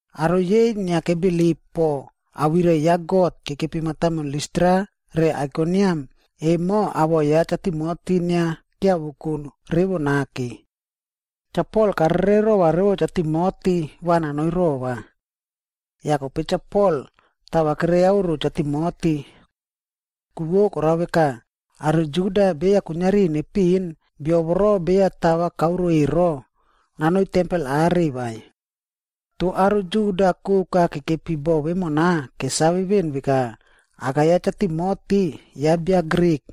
Aro yei inia kebilip po awirai ya God kekepi mataimon Listra re Aikoniam emo awoꞌo ya Cha Timoti inia kiavoko revo nake. Cha Pol karere rova Cha Timoti va nanoi rova. Yah kope Cha Pol tava keriaoro Cha Timoti. Ku vo korao veka, aro Juda beya kuiniari nepiꞌin bio voro beya tava kaoroa ero, nanoi tempel are vai. Toh aro Juda koka kekepi bo vemona kesave veꞌen veka, aka ya Cha Timoti ya bia Grik.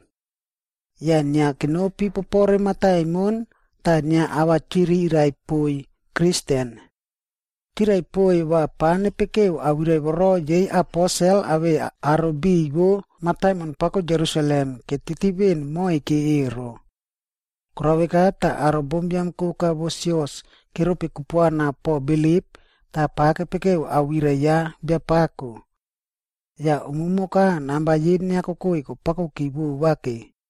Yah inia kenopi popore mataimon tah inia ava chirirai poiy Kristen. Chirai poiy va pa nepekeu awirai voro yei aposel awei aro biꞌiy vo mataimon pako Jerusalem ketiti veꞌen moike ero. Korao veka tah aro bombiam koka vo sios keropi kupuana po bilip tah pava kepekeu awirai ya Biapako. Yah umumoka namba yei inia kokoi kopakoki vovake.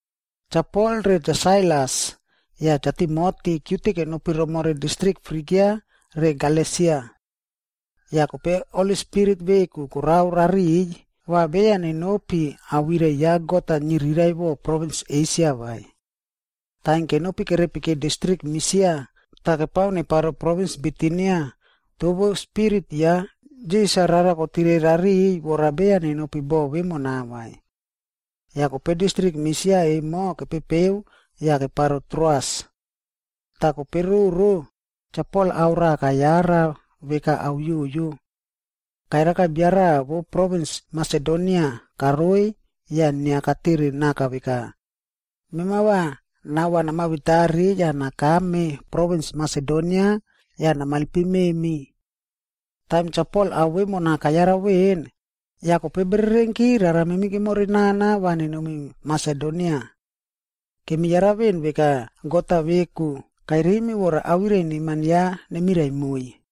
Cha Pol re Cha Sailas yah Cha Timoti kiute kenopi romore distrik Frigia re Galesia. Yah kope Holi Spirit veku korao rariꞌiy va beya nenopi awirai ya God-a niriraiꞌvo provins Esia vai. Taim kenopi kerepiki distrik Misia tah kepao neparo provins Bitinia, toh vo Spirit ya Jisas-a rara kotire rariꞌiy vora beya nenopi boꞌo vemona vai. Yah kope distrik Misia emo kepepeu yah keparo Troas. Tah kope roro, Cha Pol ao raꞌa kayara veka ao yoyo. Kayaraka bia raꞌa vo provins Masedonia karoiy yah inia katere naka veka, “Mema va nao-a namavetari yah nakame provins Masedonia yah namailpim memi.” Taim Cha Pol ao vemona kayara veꞌen, yah kope bererenki rara memib kemore nana va nenomi Masedonia. Kemi yara veꞌen veka God-a veku kairimi vora awirai neman ya nemirai moiy.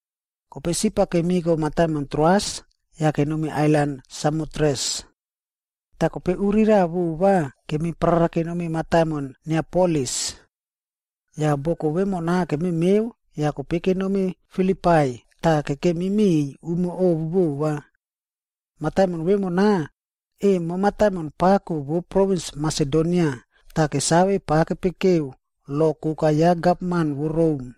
Kope sip-a kemiko mataimon Troas yah kenomi ailan Samotres. Tah kope uri raꞌa vova kemi parara kenomi mataimon Neapolis. Yah boko vemona kememeu yah kope kenomi Filipai tah kekemiki miꞌiy umo ovu vova. Mataimon vemona, emo mataimon pako vo provins Masedonia tah kesave pa kepekeu lo koka ya gavman vo Rom.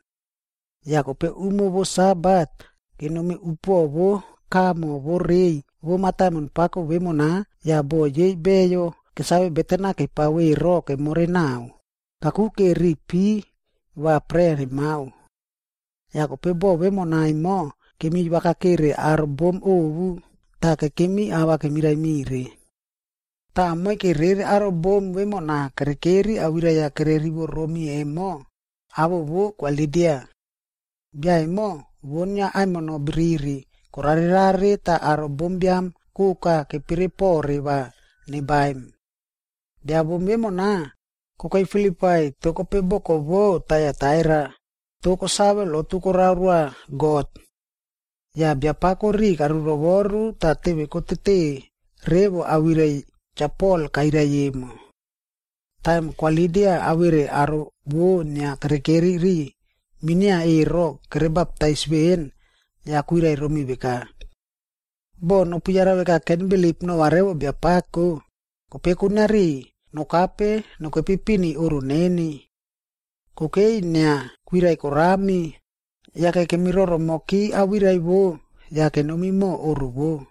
Yah kope umo vo Sabat, kenomi upuoꞌo vo kamo vo rei vo mataimon pako vemona yah boꞌo yei beyo kesave beten-a kepao ero kemore nao, kakuke ri pi va prea nemao. Yah kope bo vemona emo kemi wakakere aro bom ovu tah kekemi ava kemirai mire. Tah moike rere aro bom vemona kerekeri awirai-a kererivo romi emo, awoꞌo vo Kwa Lidia. Bia emo vo inia aimino biriri korarerare tah aro bombiam koka kepere pore va nebaim. Bia bom vemona, kokei Filipai toh kope boko vou Taiataira, tah kosave lotu korao roa God. Yah Biapako riꞌi karurovoru tah teve kotete revo awirai Cha Pol kairai emo. Taim Kwa Lidia awere aro vo inia kerekeri ri minia ero kerebaptais veꞌen, yah kwirai romi veka, “Boh nopu yara veka kenbilip nova revo Biapako, kope kuiniari nokape nokepi pini oꞌro neni.” Kokei inia kwirai korami, yake kemi roromoki awirai vo yah kenomi mo oꞌro vou.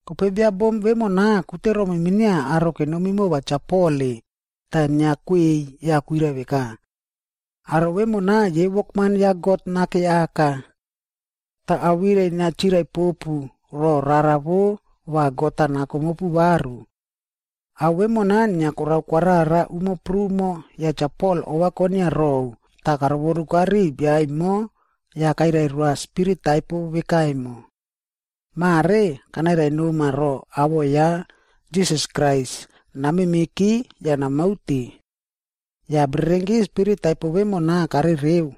Kope bia bom vemona kute romi minia aro kenomi mova Cha Pol-e, tah inia kwei yah kwirai veka, “Aro vemona yei wokman ya God Nake Aka. Tah awirai inia chirai popu ro rara vo va God-a nako mopu varu.” Ao vemona inia korao kwarara umo prumo yah Cha Pol ova konia rou tah karovoruka ri bia emo yah kairai roa spirit taipo veka emo. “Mare kanairai noma ro awoꞌo ya Jisas Krais, namemeki yah namaute.” Yah bererenki spirit taipo vemona karereu.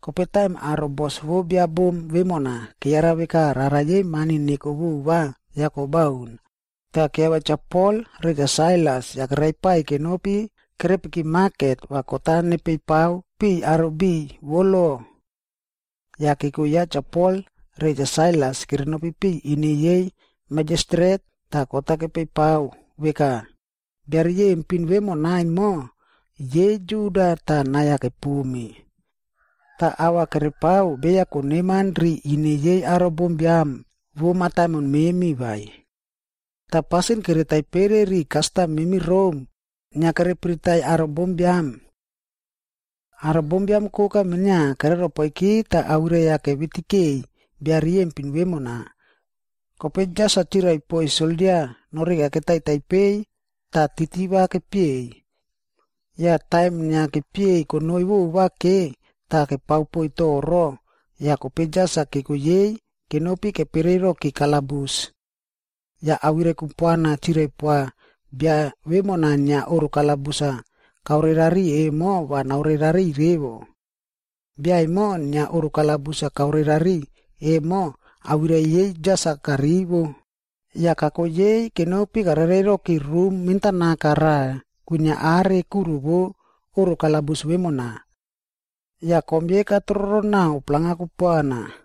Kope taim aro bos vo bia bom vemona keyara veka rara yei mani neko vova yah kobaun, tah kiavia Cha Pol re Cha Sailas yah keraipai kenopi kerekepi maket va kot-a nepei pao piꞌiy aro biꞌiy vo lo. Yah keko ya Cha Pol re Cha Sailas kenopi piꞌiy ine yei majistret tah kot-a kepeiy pao veka, “Bia riyempin vemona emo yei Juda tah nai-a kepomi. Tah ava kerepao beya koneman ri ine yei aro bombiam vo mataimon memi vai. Tah pasin kere taipere ri kastam memi Rom, inia kere piritaiy aro bombiam.” Aro bombiam koka minia keroropoiki tah awirai-a kevitikei bia riyempin vemona. Kope jas-a chirai poiy soldia noreka ketaitai peiy yah titi va kepieiy. Yah taim inia kepieiy konoi vovake tah kepao poiy toro, yah kope jas-a keko yei kenopi kepereiroki kalabus. Yah awirai kupuana chirai poa bia vemona inia oꞌro kalabus-a kaore rari emo va naore rariꞌiy revo. Bia emo inia oꞌro kalabus-a kaore rari emo awirai yei jas-a karivo, yah kako yei kenopi karerei roki rum mentanaka raꞌa kwinia are kuro vo oꞌro kalabus vemona. Yah kom yei katroro nao palang-a kupuana.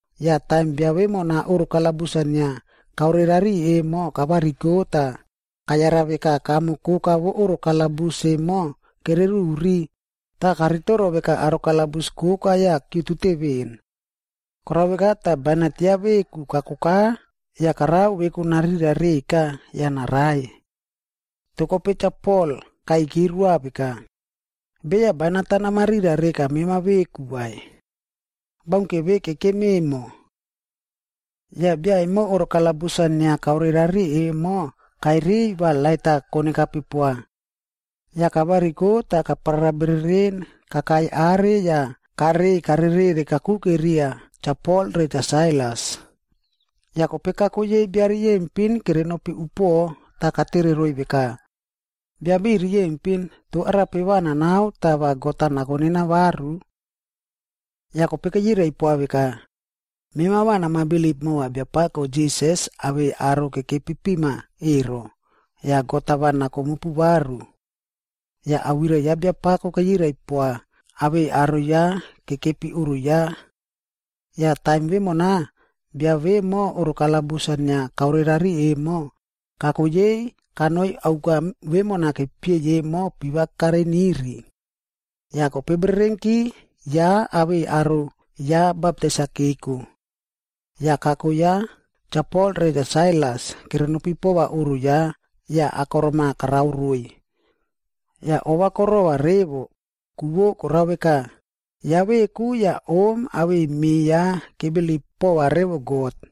Yah taim bia vemona oꞌro kalabus-a inia kaore rari emo kavariko tah kayara veka kamo koka vo oꞌro kalabus emo kereruri, tah karitoro veka aro kalabus koka yah kiutute veni. Korao veka tah bainat ya veku kakoka yah karao veku narira reka yah narai. Toh kope Cha Pol kaiyki roa veka, “Beya bainat-a namarira reka mema veku vai! Baunke ve kekem emo.” Yah bia emo oꞌro kalabus-a inia kaore rari emo kairiy va lait-a konekape poa. Yah kavariko tah kaprara bereren kakai are yah karei karereꞌre kakuke riya Cha Pol re Cha Sailas. Yah kope kako yei bia riyempin kerenopi upuoꞌo tah katere roiy veka, “Bia biꞌiy riyempin, toh arape va nanao tah va God-a nako nena varu?” Yah kope keyirai poa veka, “Mema va nama bilip mova Biapako Jisas awei aro kekepi pima ero, yah God-a va nako mopu varu.” Yah awirai ya Biapako keyirai poa awei aro ya kekepi oꞌro ya. Yah taim vemona, bia vemo oꞌro kalabus-a inia kaore rari emo, kako yei kanoi auka vemona kepieiy emo piva kareiniri. Yah kope bererenki ya awei aro ya baptais-a keko. Yah kako ya Cha Pol re Cha Sailas kerenopi pova oꞌro ya yah akorom-a karao roiy. Yah ova korova revo, ku vo korao veka, ya veku yah om awei me ya kebilip pova revo God.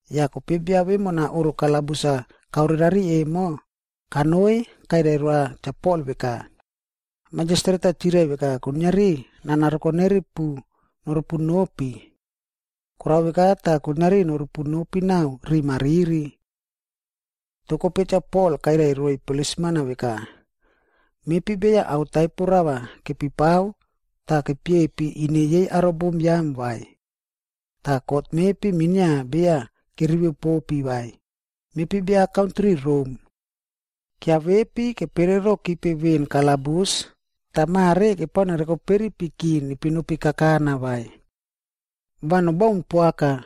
Yah kope bia vemona oꞌro kalabus-a kaore rari emo, kanoi kairai roa Cha Pol veka, “Majistret-a chirai veka kuiniari nana rokoneripu noropu nopi. Korao veka tah kuiniari noropu nopi nao riꞌi mariri.” Toh kope Cha Pol kairai roiy plisman-a veka, “Mepi beya ao taipo rava kepipao tah kepiepi ine yei aro bombiam vai. Tah kot mepi minia beya kerivo popi vai. Mepi bia kantri Rom.c Kiavepi kepere rokipe veꞌen kalabus tah mare kepao nerokoperipiki nepi nopi kakana vai? Va nobaun poaka!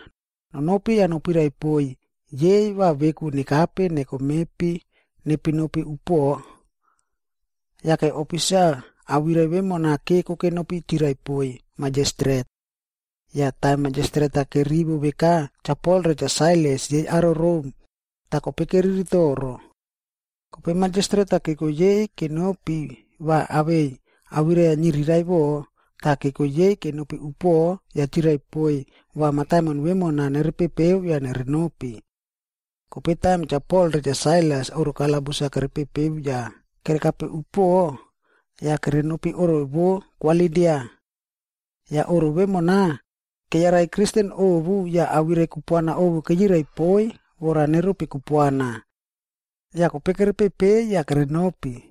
Nonopi yah nopirai poiy yei va veku nekape neko mepi nepi nopi upuoꞌo.” Yake ofisa awirai vemona keko kenopi chirai poiy majistret. Yah taim majistret-a kerivo veka Cha Pol re Cha Sailas yei aro Rom, tah kope keriri toro. Kope majistret-a keko yei kenopi va awei awirai-a niriraiꞌvo tah keko yei kenopi upuoꞌo yah chirai poiy va mataimon vemona nerepepeu yah nerenopi. Kope taim Cha Pol re Cha Sailas oꞌro kalabus-a kerepepeu yah kerekape upuoꞌo, yah kerenopi oꞌro vo Kwa Lidia. Yah oꞌro vemona, keyarai Kristen ovu yah awirai kupuana ovu keyirai poiy vora neropi kupuana. Yah kope kerepepei yah kerenopi.